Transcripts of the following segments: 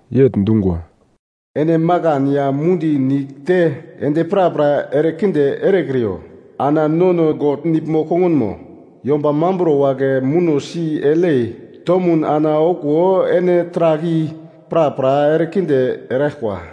yegl dungwa, “Ene makan ya mundi nigl te endi prapra erekinde erekriyo ana nono God nigl-kongunmo yomba mamburo wagle muno si eglyei tomun ana okuwo ene taragl i prapra erekinde eraglkwa.”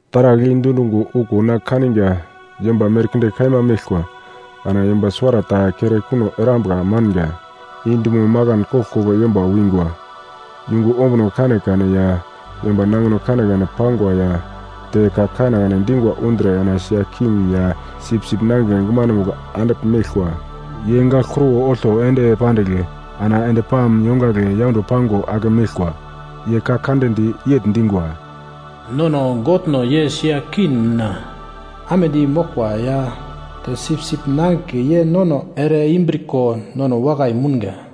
Taragl i dundungo okuwo na kaniga yomba merkinde kaima meglkwa. Ana yomba suwarata kere kuno erambuka manga, i dumo makan koglkoglo yomba wingwa, yungu ombuno kanekane ya yomba nangino kanekane pangwa ya te ka kanekane dingwa undre ana sia king ya Sipsip Nangigle gumanomugl andigl meglkwa. Ye gagl kruwo olto ende pandigl ana endi palm yongagle yaundo pango ake meglkwa. Ye ka kande di yegl dingwa: “Nono Godno ye sia king mina amedi moglkwa ya te Sipsip Nangigle ye nono ereimbriko nono wakai mounga.”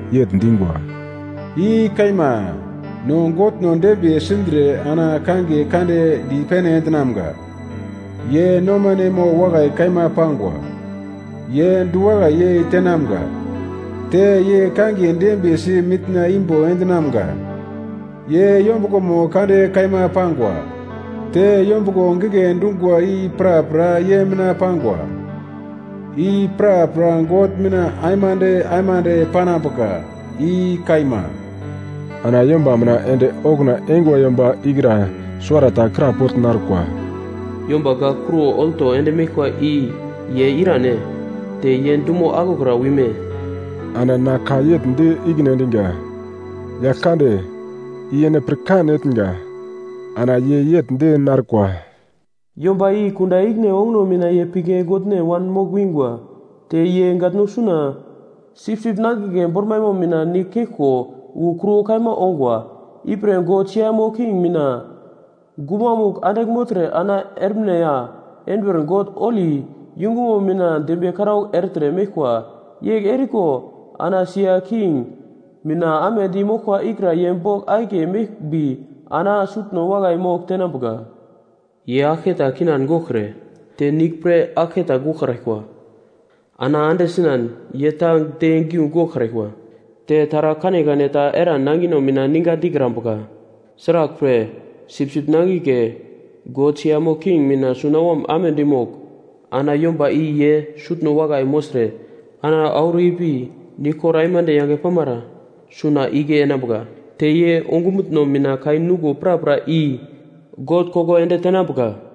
yegl dingwa: “I kaima! No Godno dembiye sindre ana kangiye kande dipene endinamga! Ye nomanemo wakai kaima pangwa, ye diwakai yei tenamga, te ye kangiye dembiyesi mitna imbo endinamga! Ye yombuglomo kande kaima pangwa! Te yombuglo gigle dungwa i prapra ye mina pangwa! I prapra God mina aimande aimande panambuka! I kaima!” Ana yomba mina ende okuna eingwa yomba ikra suwarata krapogl narkwa, “Yomba gagl kruwo olto ende meglkwa i ye irane? Te ye dumo aglokra wime?” Ana na ka yegl di ikine endiga, “Yagl kande, i ene pirkan etnga.” Ana ye yegl di narkwa, “Yomba i kunda ikine onguno mina ye pigle goglne wanmogl wingwa, te ye gatno suna Sipsip Nangigle bormaimo mina nigl keglko wu kruwo kaima ongwa. Ipre, “God siamo king mina gumamugl andigl mogltre ana ermine ya enduwer God holi yungumo mina dembiye karaugl ertre meglkwa. Yegl eriko ana sia king mina amedi moglkwa ikra ye bogl akiye meglmbi ana sutno wakai mogl tenambuka. Ye aglketa kindan goglkre te nigl pre aglke ta goglkraglkwa. Ana ande sinan ye ta de giu goglkraglkwa, te taragl kanekane ta eran nangino mina ninga dikrambuka. Sraglpre, Sipsip Nangigle, God siamo king mina sunawom amedi mogl ana yomba i ye sutno wakai mogltre ana auro ipi niglkor aimande yange pamara suna igle enambuka. Te ye ongumutno mina kai nuglo prapra i God koko ende tenambuka.”